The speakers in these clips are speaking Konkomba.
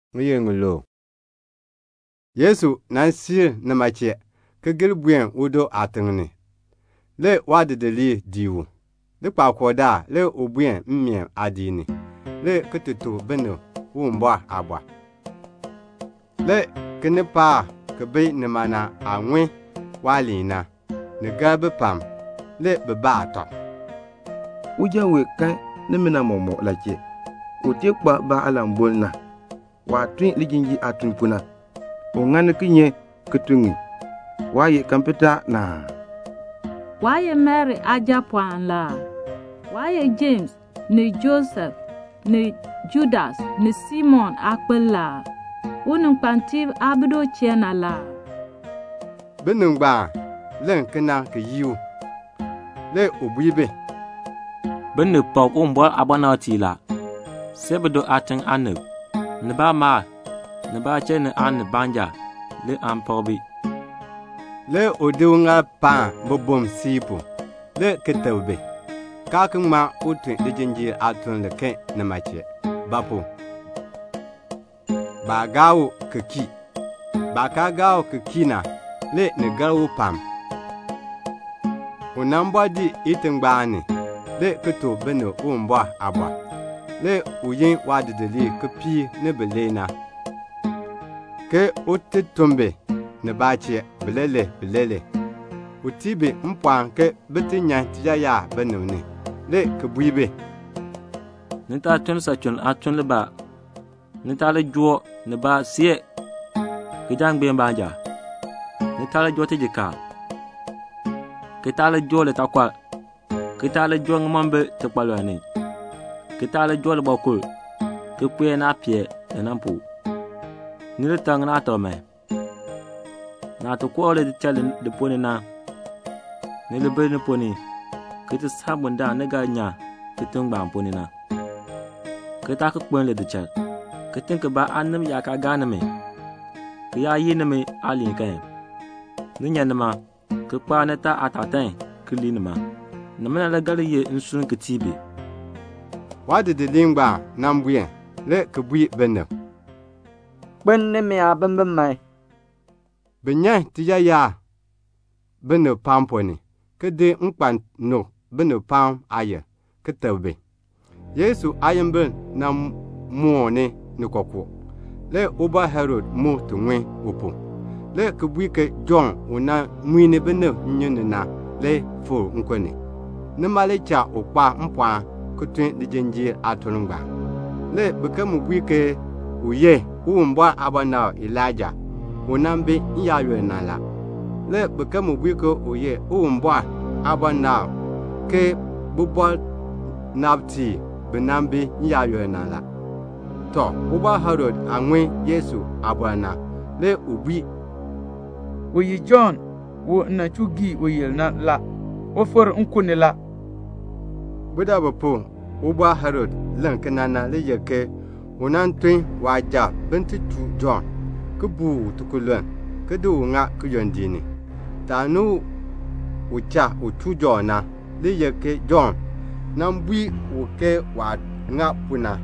Le Yesu siir nima chee, ki gir buen udo aatiŋ ni. Le waadidiliib dii u. Likpakool daal, le u buen mmeen aadiik ni, le ki tuk binib Uwumbɔr aaliin. Le kinipaak bi bi nima na aah ŋun waaliin na, ni gar bi pam. Le bi baa tɔb, "Uja wee kan nimina mɔmɔk la chee? U tee kpa ba aalanboln na? Waah tun lijinjiir aatun pu na, u ŋani kinye ki tun ŋi? Waa ye kapenta na aa? Waa ye Mari aajapɔɔn la aa? Waa ye Jems ni Joses ni Judas ni Simon aakpil la aa? Uninkpatiib aa bi du chee na la aa?" Binib ngbaan len kena ki yii u. Le u bui bi, "Binib pak Uwumbɔr aabɔnabtiib la, see bido aatiŋ aanib, ni baamaal, ni baachiln ni aanib baanja le aan pak bi." Le u di uŋaal paan bibum siib pu, le ki teb bi, kaa ki ŋma tun lijinjiir aatuln liken nima chee; ba pu? baa gaa u ki kii. Baah kaa gaa u ki kii na, le ni gar u pam. Le u bɔɔ dii itingbaan ni, le ki tuk binib Uwumbɔr aaliin. Le u yin waadidiliib kipiik ni bilee, ke un ti tun bi nibaa chee, bileelee, bileelee. U tii bi mpɔɔn ke bin ti nyan tiyaayar binib ni, le ki bui bi, "Ni taa tun lisachuln aatuln libaa. Ni taa li joo nibaa see kijangbeek baanja. Ni taa li joo tijikaar, ki taa li joo litaakɔr, ki taa li joo ŋimombil tikpalɔl ni, ki taa li joo libɔkul ki kpee naah pee li na pu. Ni li tak ŋinaatak man. Naah ti koo lidichal li ponn ni na, ni li bi li ponn ni ki ti saa bundaln ni ga nyan kitiŋ ngbaan ponn ni na, ki taa ki jir lidichal. Kitiŋ kibaa aanib yaa kaa gaa nimi, ki yaa yii nimi aaliin kan, ni nyan nima, ki kpaar nitaa aatatan ki lii nima. Nimina le ga li ye nsurm ki tii bi." Le waadidiliib buen, le ki bui binib, "Kpeln nimi aabimbin man." Bi nyan tiyaayar binib pam ponn ni, ki di nkpan, ki di nuk binib pam aayil, ki teb bi. Le Yesu aayimbil moon ni kookoo. Le Ubɔr Herod mu ŋun u pu, le ki bui ke Jɔnn u nan muin binib nnyun ni na fikr nkun ni la, nima le cha u kpa mpɔɔn ki tun lijinjiir aatun ngbaan. Le biken mu bui ke u ye Uwumbɔr aabɔnabr Elaija u nan bi n-yaayoonn na la. Le biken mu bui ke u ye Uwumbɔr aabɔnabr ke bibɔnabtiib bi nan bi n-yaayoonn na la. Tɔ, Ubɔr Herod aah ŋun Yesu aabɔr na, le u bui, "U ye Jɔnn, u m nan chuu gii uyil na. U fikr nkun ni la." Budabu pu Ubɔr Herod len kena na le ye ke u nan tun waasujatiib bin ti chuu Jɔnn, ki buu u tikululn, ki di ŋa kiyondiik ni. Taani u cha u chuu u na, le ye ke Jɔnn nan bui u ke waah ŋa pu na,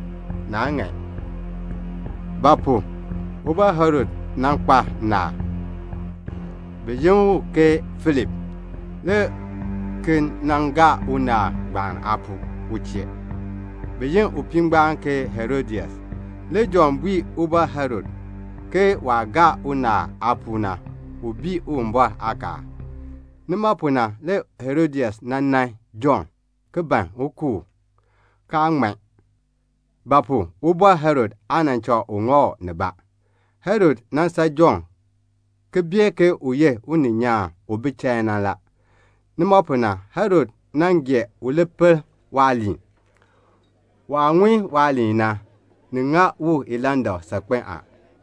naa ŋan. Ba pu? Ubɔr Herod kpa naal, bi yi u ke Filip, le ki nan gaa unaal ngbaan aapuu u chee. Bi yi upii ngbaan ke Herodias. Le Jɔnn bui Ubɔr Herod ke waah gaa unaal aapuu na, u bii Uwumbɔr aakaal la. Nima pu na le Herodias nan nan Jɔnn, ki ban un ku u, kaa ŋman; ba pu? Ubɔr Herod aa cha u ŋa u nibaa. Herod san Jɔnn ki bee ke u ye uninyaan u bi chain na. Nima pu na, le Herod gee un pel waaliin. Waah ŋun waaliin na, ni ŋa u ilandak saakpen a.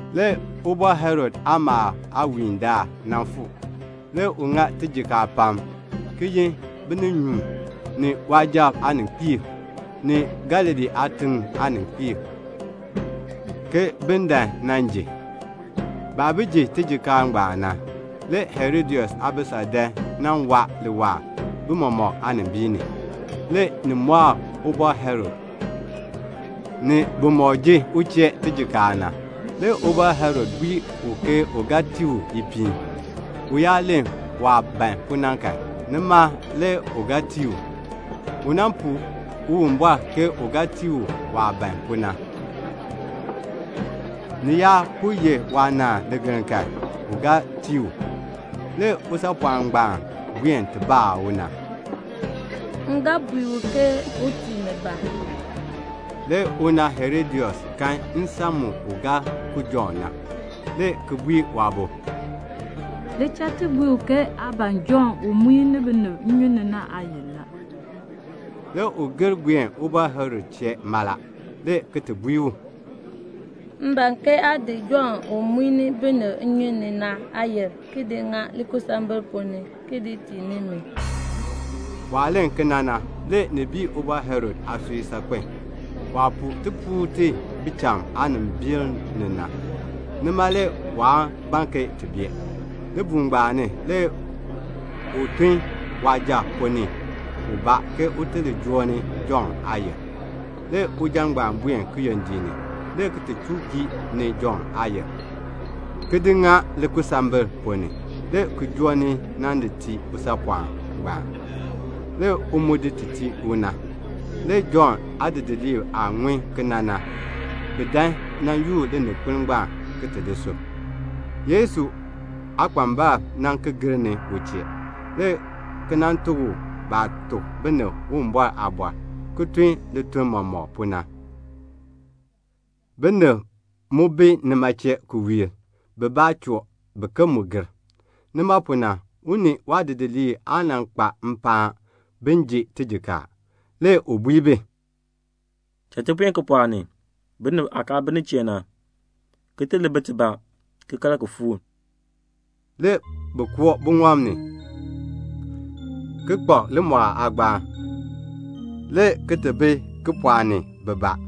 Le Ubɔr Herod aamalndaal aawiin nan fuu. Le u ŋa tijikaar pam, le ki yin bininyuun, ni waasujatiib aaninkpiib, ni Galilee aatiŋ aaninkpiib, ke bin dan nan ji. Baah bi ji tijikaar ngbaan na, le Herodias aabisal dan nan saar bi mɔmɔk aanimbiin ni. Le ni mɔɔ Ubɔr Herod, ni bimɔk ji u chee tijikaar na. Le Ubɔr Herod bui u ke u ga tii u ipiin. U yaa len waah ban pu na kan, nima le u ga tii u. U puu Uwumbɔr ke u ga tii u waah ban pu na; ni yaa po ye waanaan ligeln kan, u ga tii u. Le usaapɔɔn ngbaan buen ti baa una, "M ga bui u ke un tii mi ba?" Le una Herodias kan nsan mu u ga ku Jɔnn na. Le u bui waabo, "Li cha ti bui u ke aa ban Jɔnn u muin binib nnyun ni na aayil la." Le u gir buen Ubɔr Herod chee mala, le ki ti bui u, "M ban ke aa di Jɔnn u muin binib nnyun ni na aayil, ki di ŋa likusambil ponn ni, ki di tii ni mi." Waah len kena na, le ni bii Ubɔr Herod aasui saakpen a. Waah puu tipuul ti bicham aanimbil ni na, nima le waa ban ke ti bee. Libuul ngbaan ni le u tun suja ubaa ke un ti li joo ni Jɔnn aayil. Le suja ngbaan buen kiyondiik ni, le ki ti chuu gii ni Jɔnn aayil, ki di ŋa likusambil ponn ni, le ki joo ni nan di tii usaapɔɔn ngbaan. Le u mu di ti tii una. Le Jɔnn aadidiliib aah ŋun kena na, bi dan nan yoor lininkpol ngbaan, ki ti di sub. Le Yesu aakpambalb ki gir ni u chee, le ki nan tuk u baah tuk binib Uwumbɔr aaliin, ki tun lituln mɔmɔk pu na. Binib mu bi nima chee ki wiir, bibaa choo, biken mu gir. Nima pu na le u ni waadidiliib aa kpa mpaan bin ji tijikaar. Le u bui bi, "Cha ti buen kipɔɔk ni, binib aah kaa bi nin chee na, ki ti li bi tibaa, ki kal ki fuur." Le bi koo buŋɔb ni, ki kpak limɔɔl aagbaan, le ki ti bi kipɔɔk ni, bibaa.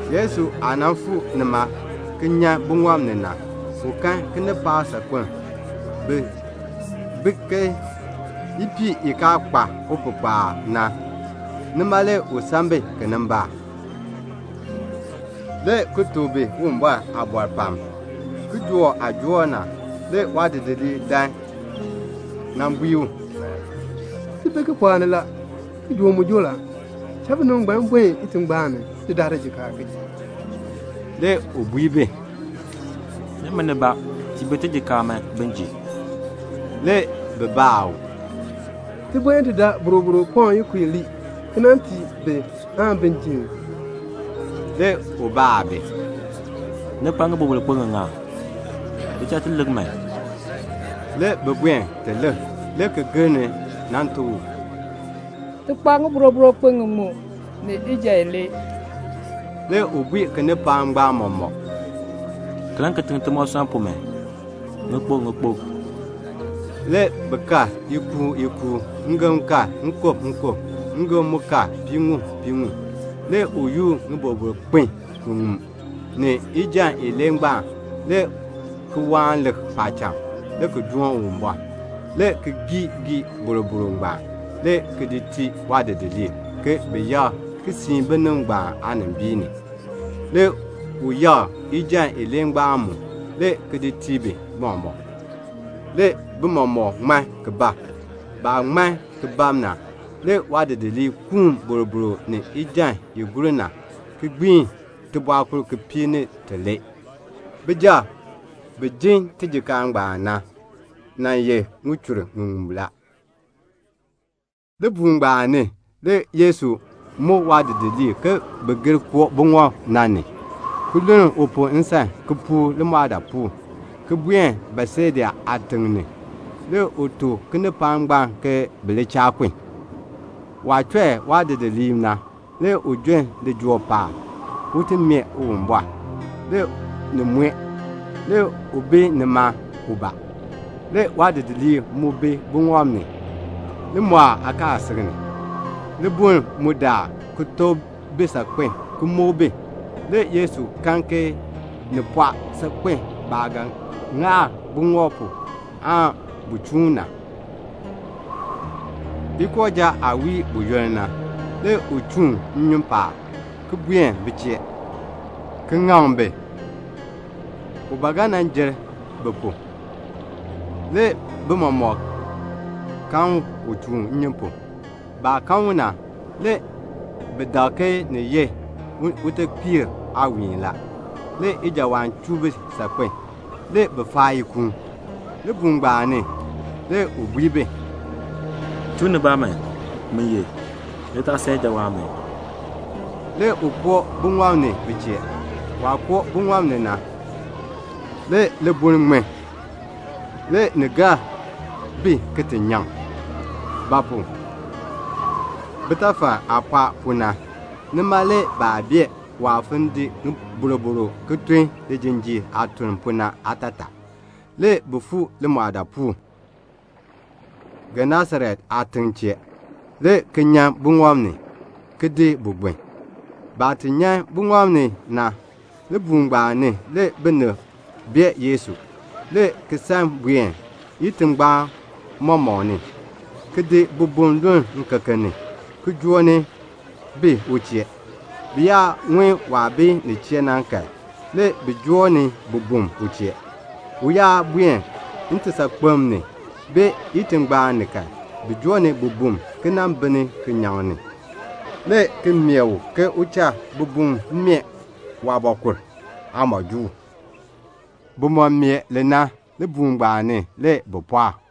Le Yesu aah fuu nima ki nyan buŋɔb ni na, u kan kinipaak saakpeŋ. Bi bi ke ipiih i kaa kpa upihkpaal na. Nima le u san bi kinimbaak, le ki tuk bi Uwumbɔr aaliin pam. Le kijook aah joor na, waadidiliib dan nan bui u, "Ti bi kipɔɔk ni la. Kijook mu joor la. Tun binib ngbaan bin buen itingbaan ni ki ti daa tijikaar ki ji." Le u bui bi, "Nimi, tiin bi tijikaar man, bin ji." Le bi baa u, "Ti buen ti daa boroboro pɔŋ ikub ilee aan ki nan tii bi, bin ji ii?" Le u baa bi, "Ni kpa ŋiboroboro kpin ŋiŋa? Li cha ti lik man." Le bi buen ti lik, le ki gir ni nan tuk u, "Ti kpa ŋiboroboro kpin ŋiŋmu ni ijan ilee." Le u bui kinipaak ngbaan mɔmɔk, "Kaln timoosɔnn pu kitiŋ man, ŋikpuk ŋikpuk." Le bi kal ikuul ikuul. Ngem kal nkub nkub, ngem mu kal piiŋmu piiŋmu. Le u yoor ŋiboroboro kpin ŋiŋmu, ni ijan ilee ngbaan, le ki waan lik paacham, le ki doon Uwumbɔr, le ki gii gii boroboro ngbaan, le ki di tii waadidiliib, ke bi yakr ki siin binib ngbaan aanimbiin ni. Le u yakr ijan ilee ngbaan mu, le ki di tii bi mɔmɔk. Le bi mɔmɔk ŋman ki bab. Le baah ŋman ki bab na, waadidiliib yoor boroboro ni ijan i gur na, ki gbiin tibɔɔkur kipiik ni tilee. Bijab bi jin tijikaar ngbaan na, bi nan ye ŋichur ŋiŋmu la. Libuul ngbaan ni le Yesu muk waadidiliib ke bin gir koo buŋɔb na ni, ki luln u pu nsan, ki puur limɔɔdaapuul, ki buen Betseda aatiŋ ni. Le u tuk kinipaak ngbaan ke bi li cha kun. Waah chɔi waadidiliib na, le u jon lijool paab, un ti mee Uwumbɔr. Le ni mue. Le u bi nima, ubaa. Le waadidiliib mu bi buŋɔb ni, limɔɔl aakaasisik ni. Libuln mu daar ki tok bi saakpen ki muk bi. Le Yesu kan ke ni pɔɔ saakpen baah ga ŋaar buŋɔb pu aan bu chuun na. Ikooja aah wii buyoonn na, le u chuun nnyun paab, ki buen bi chee, ki ŋaŋ bi. U ba ga jer bi pu. Le bi mɔmɔk kan u chuun nnyun pu. Le baah kan u na, bi dak ke ni ye utekpiir aawiin la. Le ijawaan chuu bi saakpen a. Le bi faa ikuun. Libuul ngbaan ni le u bui bi, "Chuu nibaa man. Min ye. Ni taa san ijawaan man," le ki koo buŋɔb ni bi chee. Waah koo buŋɔb ni na, le libuln ŋmin. Le ni gar bi ki ti nyaŋ; ba pu? bitafal aah pɔɔ pu na, nima le baa bee waah fon di boroboro ki tun lijinjiir aatuln pu na aatataa. Le bi fuu limɔɔdaapuul, Genesaret aatiŋ chee, le ki nyan buŋɔb ni, le ki gbin bu. Baah ti nyan buŋɔb ni na, libuul ngbaan ni le binib bee Yesu, le ki san buen itingbaan mɔmɔk ni, le ki di bibum luln ŋikeken ni, le ki joo ni bi u chee. Bi yaa ŋun waah bi nin chee na kan, le bi joo ni bibum u chee. U yaa buen ntisaakpem ni, bee itingbaan ni kan, le bi joo ni bibum, ki nan di bil kinyaŋ ni, le ki mee u ke u cha bibum meeh waabɔkul aamɔjuul. Bimɔk aah meeh li na, libuul ngbaan ni le bi pɔɔk.